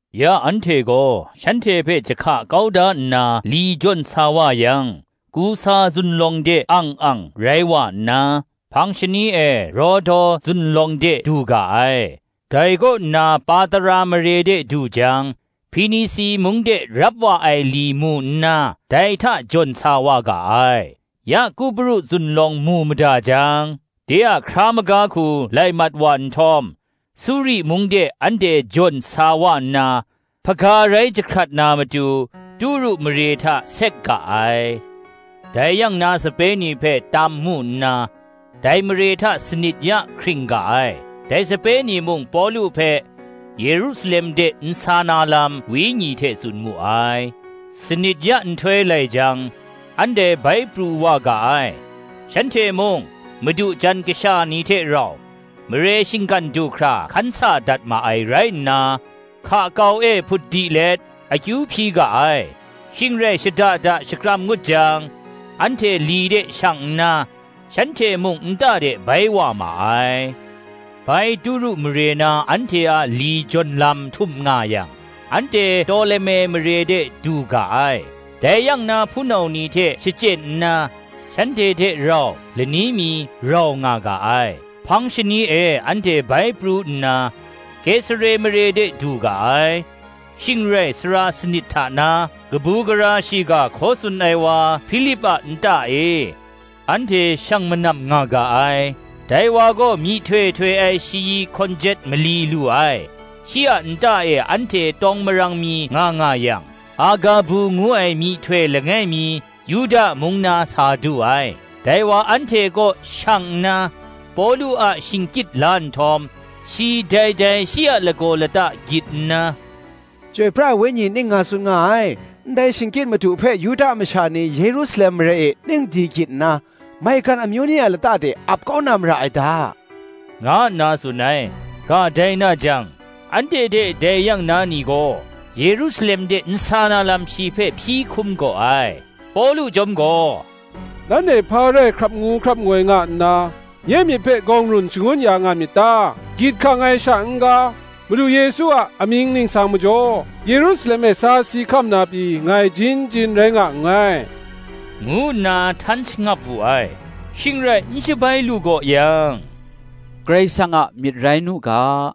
Ya anhte gaw shanhte hpe jahka kau da nna li jawn sa wa yang, Kusa zunlawng de ang ang rai wa nna, hpang shani e Rodo zunlawng de du ga ai; dai kaw nna Patara mare de du jang, Hpinisi mung de rap wa ai li mu nna, dai hta jawn sa wa ga ai. Ya Kupru zunlawng mu mada jang, de a hkra maga hku lai mat wa nhtawm, Suri mung de anhte jawn sa wa nna, hpaga rai jahkrat na matu, Turu mare hta sek ga ai. Dai yang na sape ni hpe tam mu nna, dai mare hta sanit ya hkring ga ai: dai sape ni mung Pawlu hpe, Yerusalem de n sa na lam, Wenyi hte tsun mu ai. Sanit ya nhtoi lai jang, anhte bai pru wa ga ai; shanhte mung, madu jan kasha ni hte rau, mare shinggan du hkra hkan sa dat ma ai rai nna, hka kau e hput di let, akyu hpyi ga ai: shing rai shada da shakram ngut jang, anhte li de shang nna, shanhte mung nta de bai wa ma ai. Bai Turu mare na anhte a li jawn lam htum nga yang, anhte Toleme mare de du ga ai; dai yang na hpunau ni hte shachyen nna, shanhte hte rau lani mi rau nga ga ai. Hpang shani e anhte bai pru nna, Kesare mare de du ga ai; shing rai sara sanit hta na, kabu gara shiga hkaw tsun ai wa Hpilip a nta e, anhte shang manam nga ga ai. Dai wa gaw myihtoi htoi ai shayi hkawn jet mali lu ai. Shi a nta e anhte tawng marang mi nga nga yang, Agabu ngu ai myihtoi langai mi, Yuda mung na sa du ai. Dai wa anhte kaw shang nna Pawlu a shingkyit la nhtawm, shi dai dai shi a lagaw lata gyit nna, “Chyoi pra ai Wenyi ning nga tsun nga ai, Ndai shingkyit madu hpe Yuda masha ni Yerusalem mare e ning di gyit nna, maigan amyu ni a lata de ap kau na mara ai da,” nga nna tsun ai. Ga dai na jang, anhte hte dai yang na ni gaw, Yerusalem de n sa na lam shi hpe hpyi hkum gaw ai. Pawlu chyawm gaw, “Nanhte hpa rai hkrap ngu hkrap ngoi nga nna, nye myit hpe gawng run shangun ya nga myit ta? gyit hkang ai sha n-ga, Madu Yesu a amying ningsang majaw, Yerusalem e sa si hkam na pyi ngai jin jin rai nga nngai,” ngu nna htan shangap wu ai. Shing rai n shabai lu gaw yang, “Karai Kasang a myit rai nu ga,”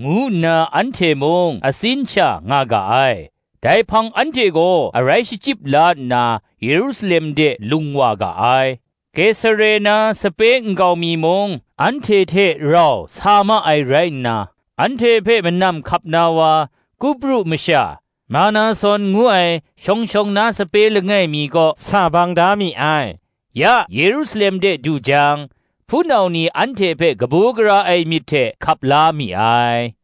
ngu nna anhte mung atsin sha nga ga ai. Dai hpang anhte gaw arai shachyip la nna Yerusalem de lung wa ga ai. Kesare na sape nkau mi mung, anhte hte rau sa ma ai rai nna, anhte hpe manam hkap na wa, Kupru masha, Manason ngu ai shawng shawng na sape langai mi kaw sa bang da mi ai. Ya Yerusalem de du jang, hpunau ni anhte hpe kabu gara ai myit hte hkap la mi ai.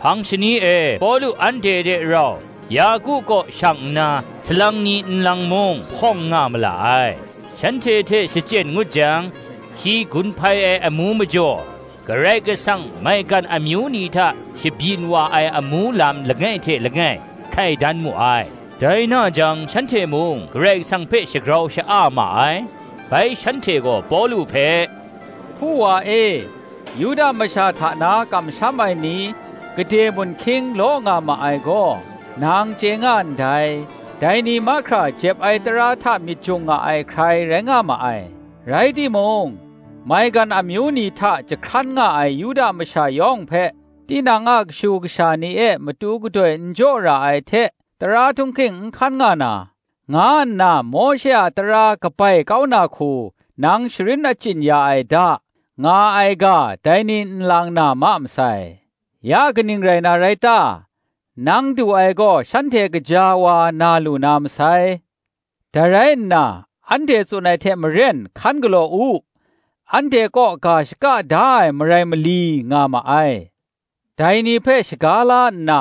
Hpang shani e Pawlu anhte hte rau Yaku kaw shang nna, salang ni nlang mung hpawng nga ma la ai. Shanhte hte shachyen ngut jang, shi gun hpai ai amu majaw, Karai Kasang maigan amyu ni hta shabyin wa ai amu lam langai hte langai hkai dan mu ai. Dai na jang shanhte mung Karai Kasang hpe shagrau sha-a ma ai: bai shanhte gaw Pawlu hpe, “Hpu wa e, Yuda masha hta na kamsham ai ni gade mun hkying law nga ma ai gaw, nang chye nga ndai; dai ni mahkra jep ai tara hta myit jung ai hkrai rai nga ma ai: rai timung, maigan amyu ni hta jahkran nga ai Yuda masha yawng hpe, tinang a kashu kasha ni e matu gadoi n jaw ra ai hte, tara htung hking n hkan nga na, nga nna Mawshe a tara kabai kau na hku nang sharin achyin ya ai da, nga ai ga dai ni nlang na ma masai. Ya kaning rai na rai ta? Nang du ai gaw shanhte kaja wa na lu na masai. Dai rai nna anhte tsun ai hte maren hkan galaw u: anhte kaw ga shaka da ai marai mali nga ma ai. Dai ni hpe shaga la nna,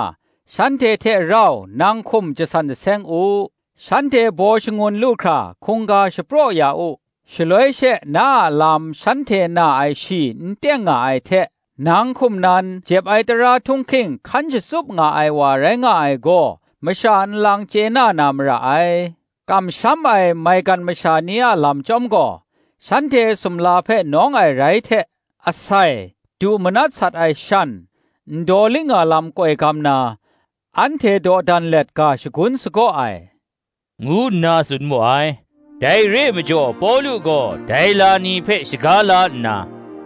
shanhte hte rau nang hkum jasan jaseng u; shanhte baw shangun lu hkra hkungga jahpu shapraw ya u: shaloi she na a lam shanhte na ai shi n teng nga ai hte, nang hkum nan jep ai tara htung hking hkan shatsup ai wa rai nga ai gaw, masha nlang chye na na mara ai. Kamsham ai maigan masha ni a lam chyawm gaw, shanhte sumla hpe nawng ai rai hte, asai, du manat sat ai shan, ndaw liknga lam koi gam na, anhte dawdan let ga shangun sagaw ai,” ngu nna tsun mu ai. Dai re ai majaw Pawlu gaw dai la ni hpe shaga la nna,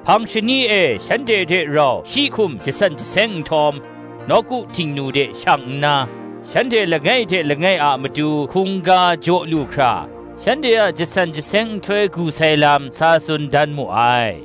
hpang shani e shanhte hte rau shi hkum jasan jaseng nhtawm, nawku Htingnu de shang nna, shanhte langai hte langai a matu hkungga jaw lu hkra, shanhte a jasan jaseng nhtoi gu sai lam sa tsun dan mu ai.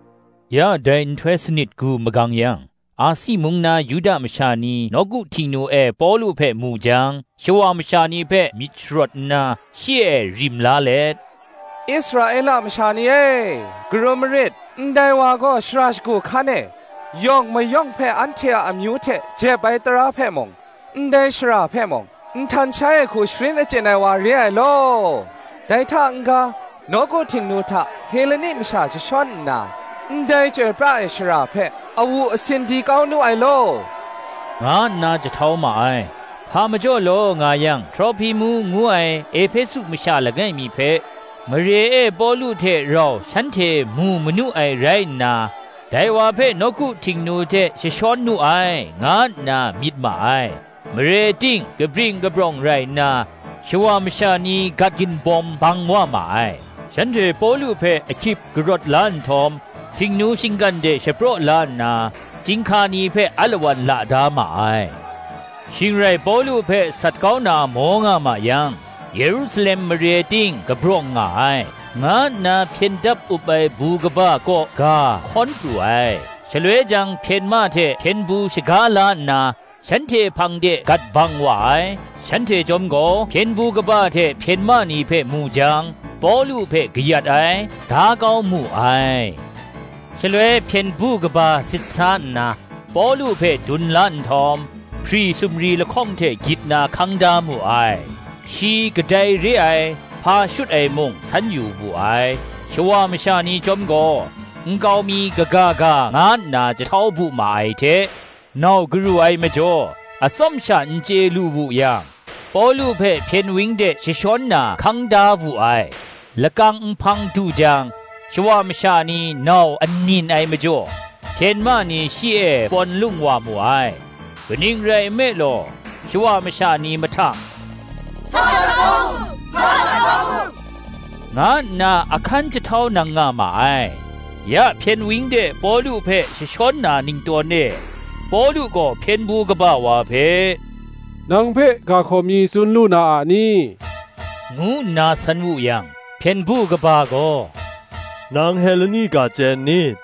Ya dai nhtoi sanit gu magang yang, Asi mung na Yuda masha ni nawku Htingnu e Pawlu hpe mu jang, shawa masha ni hpe myit sharawt nna, shi e rim la let, “Israela masha ni e, karum marit; ndai wa gaw shara shagu hkan e yawng mayawng hpe anhte a amyu hte jep ai tara hpe mung, ndai shara hpe mung, nhtan shai ai hku sharin achyin ai wa re ai law; dai hta n-ga, nawku Htingnu hta Heleni masha jashawn nna, ndai chyoi pra ai shara hpe awu asin di kau nu ai law,” nga nna jahtau ma ai. Hpa majaw law nga yang, Trohpimu ngu ai Ehpesu masha langai mi hpe, mare e Pawlu hte rau shanhte mu manu ai rai nna, dai wa hpe nawku Htingnu de jashawn nu ai, nga nna myit ma ai. Mare ting kabring kabrawng rai nna, shawa masha ni gat ginbawm bang wa ma ai; shanhte Pawlu hpe ahkyit karawt la nhtawm, Htingnu shinggan de shapraw la nna, chyinghka ni hpe alawan la da ma ai. Shing rai Pawlu hpe sat kau na maw nga ma yang, Yerusalem mare ting kabrawng nga ai, nga nna hpyen dap up ai bu kaba kaw ga hkawn pru ai. Shaloi jang hpyen ma hte hpyen du shaga la nna, shanhte hpang de gat bang wa ai: shanhte chyawm gaw hpyen du kaba hte hpyen ma ni hpe mu jang, Pawlu hpe kayat ai, da kau mu ai. Shaloi hpyen du kaba sit sa nna, Pawlu hpe dun la nhtawm, hpri sumri lahkawng hte gyit na hkang da mu ai: shi kadai re ai, hpa shut ai mung, san yu wu ai. Shawa masha ni chyawm gaw, nkau mi kaga ga nga nna jahtau bu ma ai hte, nau garu ai majaw, atsawm sha n chye lu wu yang, Pawlu hpe hpyen wang de jashawn na hkang da wu ai. Lakang nhpang du jang, shawa masha ni nau anin ai majaw, hpyen ma ni shi e pawn lung wa mu ai. kaning rai nme law, shawa masha ni mahtang, “Sa sat kau mu,” nga nna ahkan jahtau nang nga ma ai. Ya hpyen wang de Pawlu hpe jashawn na ningtawn e, Pawlu gaw hpyen du kaba wa hpe, “Nang hpe ga hkaw mi tsun lu na a ni?” ngu nna san wu yang, hpyen du kaba gaw, “Nang Heleni ga chye n ni?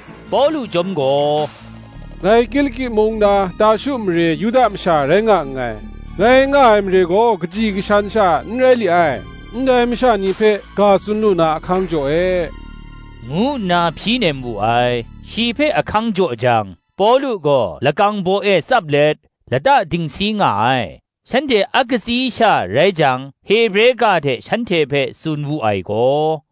Pawlu chyawm gaw, “ngai Kiliki mung na, Tarshu mare Yuda masha rai nga nngai; ngai nga ai mare gaw kaji kashan sha n rai li ai: ndai masha ni hpe ga tsun lu na ahkang jaw e,” ngu nna hpyi nem wu ai. Shi hpe ahkang jaw jang, Pawlu gaw lakang baw e tsap let, lata dingsi nga ai: shanhte a katsi sha rai jang, Hebre ga hte shanhte hpe tsun wu ai gaw,